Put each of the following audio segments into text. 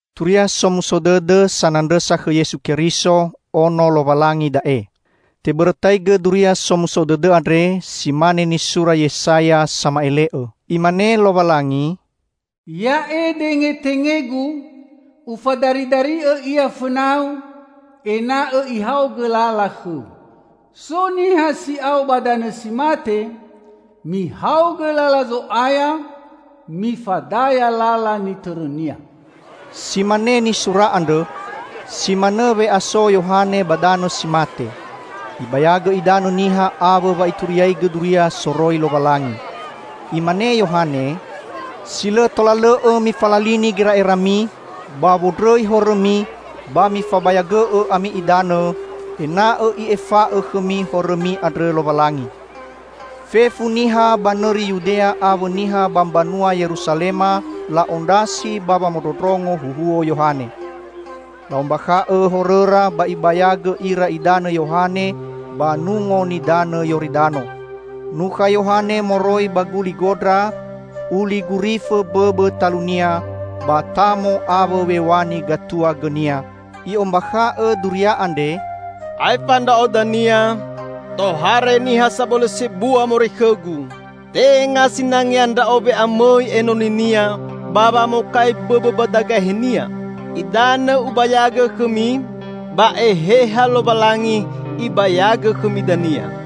Turia Somuso Dõdõ sanandrõsa khõ Yesu Keriso, Ono Lowalangi da'e. Tebõrõtaigõ Duria Somuso Dõdõ andre si mane nisura Yesaya sama'ele'õ: Imane Lowalangi, "'Ya'e dengetenge-Gu, Ufadaridari'õ ia fõna-U, ena'õ ihaogõ lala khõ-U.' So niha si'ao ba danõ si mate, 'Mihaogõ lala Zo'aya, mifadaya lala nitõrõ-Nia.'" Si mane nisura andrõ, si manõ we'aso Yohane ba danõ si mate. Ibayagõ idanõ niha awõ wa ituriagõ duria soroi Lowalangi. Imane Yohane, "Si lõ tola lõ'õ mifalalini gera'erami ba wondrõi horõmi ba mifabayagõ'õ ami idanõ, ena'õ I'efa'õ khõmi horõmi andrõ Lowalangi." Fefu niha ba nõri Yudea awõ niha ba mbanua Yerusalema la'ondrasi ba wamondrongo huhuo Yohane. La'ombakha'õ horõra ba ibayagõ ira idanõ Yohane ba Nungo Nidanõ Yoridano. Nukha Yohane moroi ba guli gondra; uli gurifõ mbõbõ talunia ba tamo awõ w̃e w̃ani gatua gõnia. I'ombakha'õ duria andre, "Aefa ndra'o dania, tohare niha sabõlõ sebua moroi khõgu. Tenga sinangea ndra'o we'amõi enoni-Nia ba wamokai bõbõ mbadagahe-Nia. Idanõ ubayagõ khõmi, ba Eheha Lowalangi Ibayagõ khõmi dania."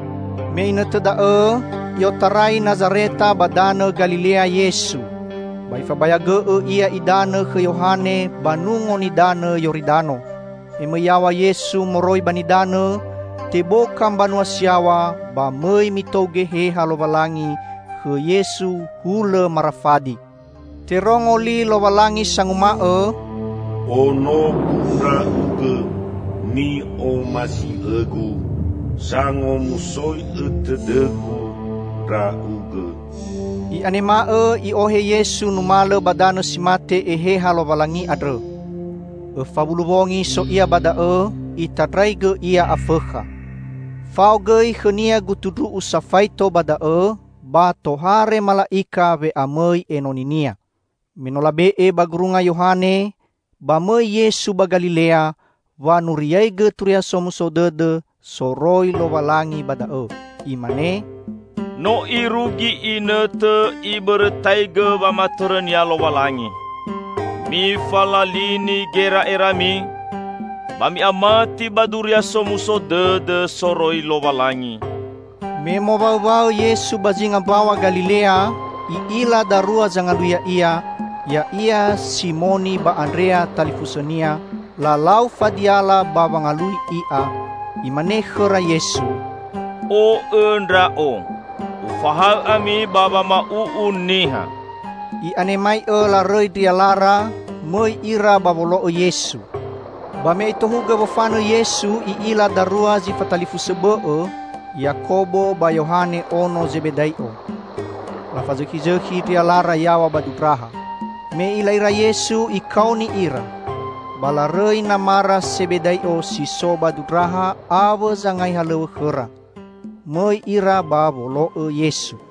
Me inõtõ da'õ, I'otarai Nazareta ba danõ Galilea Yesu, ba Ifabayagõ'õ Ia idanõ khõ Yohane ba Nungo Nidanõ Yoridano. Me mõi yaw̃a Yesu moroi ba nidanõ, teboka mbanua si yaw̃a ba mõi mitou Geheha Lowalangi khõ Yesu hulõ marafadi. Terongo li Lowalangi sanguma'õ, "Onogu Ndra'ugõ ni'omasi'õ-Gu. Sangomusoi'õ tõdõ-Gu Ndra'ugõ." I'anema'õ i'ohe Yesu numalõ ba danõ si mate Eheha Lowalangi andrõ. Õfa wulu wongi so Ia ba da'õ, itandraigõ Ia Afõkha. Fao gõi khõ-Nia gutu ndru'u safaito ba da'õ, ba tohare mala'ika we'amõi enoni-Nia. Me no labe'e ba gurunga Yohane, ba mõi Yesu ba Galilea, wanuriaigõ Turia Somuso Dõdõ soroi Lowalangi ba da'õ. Imane, "No irugi inõtõ Ibõrõtaigõ wamatõrõ-Nia Lowalangi. Mifalalini gera'erami, ba mi'amati ba Duria Somuso Dõdõ soroi Lowalangi!" Me mowaõwaõ Yesu ba zinga Mbaw̃a Galilea, I'ila darua zangalui i'a, ya'ia Simoni ba Andrea talifusõnia, lalau fadiala ba wangalui i'a. Imane khõra Yesu, "O'õ Ndra'o. Ufahaõ ami ba wama'u'u niha." I'anemai'õ larõi ndrialara, mõi ira ba wolo'õ Yesu. Ba me Itohugõ wofanõ Yesu I'ila darua zi fatalifusõ bõ'õ, Yakobo ba Yohane ono Zebedai'o. Lafazõkhizõkhi ndrialara yaw̃a ba dundraha. Me I'ila ira Yesu, Ikaoni ira. Ba larõi namara Sebedai'o si so ba dundraha awõ zangai halow̃õ khõra. Mõi ira ba wolo'õ Yesu.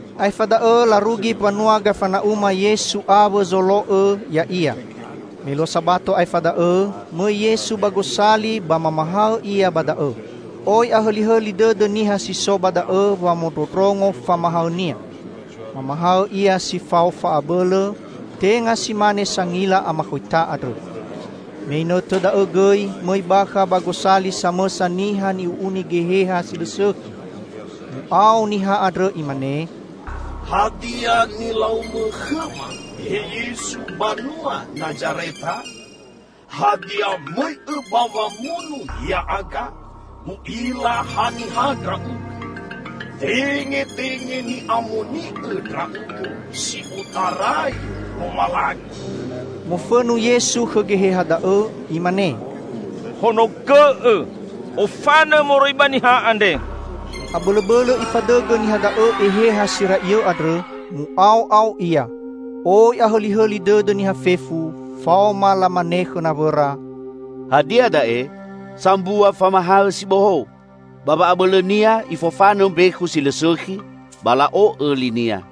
Aefa da'õ larugi mbanua Gafana'uma Yesu awõ zolo'õ Ya'ia. Me luo Sabato aefa da'õ, mõi Yesu ba gosali ba mamahaõ Ia ba da'õ. Oi ahõlihõli dõdõ niha si so ba da'õ wamondrondrongo famahaõ-Nia. Mamahaõ ia si fao fa'abõlõ, tenga si mane sangila amakhoita andrõ. Me inõtõ da'õ gõi mõi bakha ba gosali samõsa niha ni'u'uni geheha si lõ sõkhi. Mu'ao niha andrõ imane, "Hadia nilau-Mõ khõma, he Yesu, banua Nazareta? Hadia, mõi'-Õ ba wamunu ya'aga? U'ila haniha Ndra'ugõ: Tengetenge ni'amoni'õ Ndra'ugõ si otarai Lowalangi!" Mofõnu Yesu khõ geheha da'õ. Imane, "Honogõ'õ! Ofanõ moroi ba niha andre!" Abõlõbõlõ ifadõgõ niha da'õ eheha si ra'iõ andrõ, mu'ao'ao ia. Oi ahõlihõli dõdõ niha fefu, faoma lamane khõ nawõra, "Hadia da'e? Sambua famahaõ si bohou! Ba wa'abõlõ-Nia Ifofanõ mbekhu si lõ sõkhi, ba la'o'õ li-Nia!"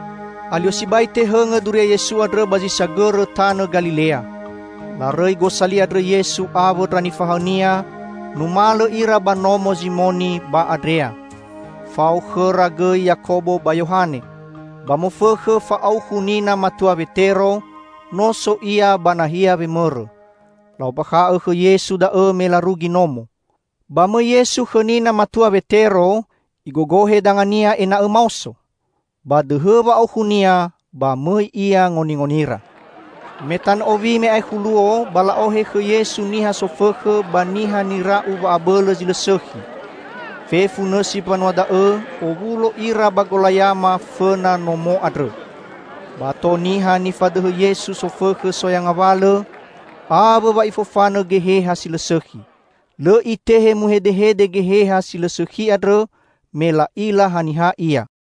Alio sibai tehõngõ duria Yesu andrõ ba zi sagõrõ tanõ Galilea. Larõi gosali andrõ Yesu awõ ndra nifahaõ-Nia, numalõ ira ba nomo Zimoni ba Andrea. Fao khõra gõi Yakobo ba Yohane. Ba mofõkhõ fa'aukhu nina matua Wetero, no so ia ba nahia wemõrõ. La'ombakha'õ khõ Yesu da'õ me larugi nomo. Ba mõi Yesu khõ nina matua Wetero, Igogohe dangania ena'õ maoso. Ba dõhõ wa'aukhunia, ba mõi ia ngoningonira. Me tanõ owi, me aekhu luo, ba la'ohe khõ Yesu niha sofõkhõ ba niha nira'u wa'abõlõ zi lõ sõkhi. Fefu nõsi mbanua da'õ, owulo ira ba golayama fõna nomo andrõ. Ba ato niha nifadõhõ Yesu sofõkhõ soya ngawalõ, awõ wa Ifofanõ geheha si lõ sõkhi. Lõ Itehe muhedehede geheha si lõ sõkhi andrõ, me la'ila haniha Ia.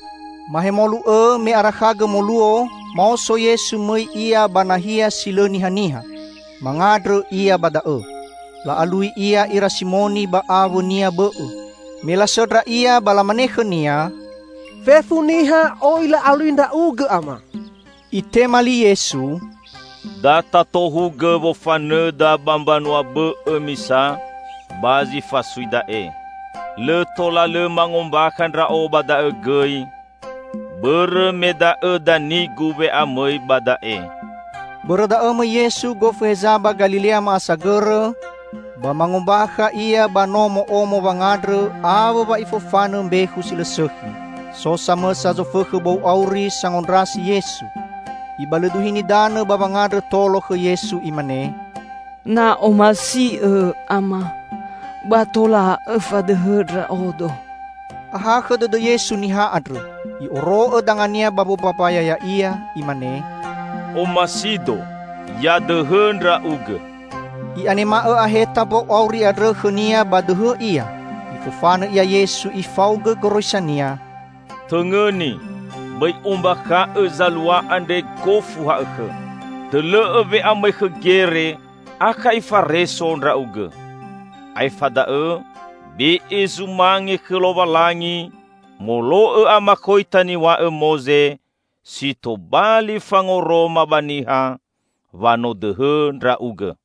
Mahemolu õ, me arakhagõ moluo, maoso Yesu mõi Ia ba nahia si lõ nihaniha. Mangandrõ Ia ba da'õ. La'alui Ia ira Simoni ba awõnia bõ'õ. Me lasõndra Ia ba lamane khõ-Nia, "Fefu niha oi la'alui Ndra'ugõ, Ama." Itema li Yesu, "Da tatohugõ wofanõda ba mbanua bõ'õ misa ba zi fasui da'e. Lõ tola lõ mangombakha Ndra'o ba da'õ gõi, bõrõ me da'õ dani-Gu we'amõi ba da'e." Bõrõ da'õ mõi Yesu gofu heza ba Galilea ma'asagõrõ, ba mangombakha Ia ba nomo'omo wangandrõ awõ wa Ifofanõ mbekhu si lõ sõkhi. So samõsa zofõkhõ bou auri sangondrasi Yesu. Ibalõduhini danõ ba wangandrõ tolo khõ Yesu imane, "Na omasi'Õ, Ama, ba tola Õfadõhõ ndra'odo." Ahakhõ dõdõ Yesu niha andrõ. I'oro'õ danga-Nia ba wombambaya ya'ia. Imane, "O'masi-Do, ya dõhõ ndra'ugõ!" I'anema'õ' aheta mbou auri andrõ khõnia ba dõhõ ia. Ifofanõ ia Yesu Ifaogõ goroisa-Nia, "Tõngõni, bõi ombakha'õ zalua andre gofu ha'õkhõ. Dõlõ'õ we'amõi khõ gere, akha ifareso ndra'ugõ. Aefa da'õ, be'e zumange khõ Lowalangi molo'õ amakhoita niw̃a'õ Moze, si tobali fangoroma ba niha wa no dõhõ ndra'ugõ."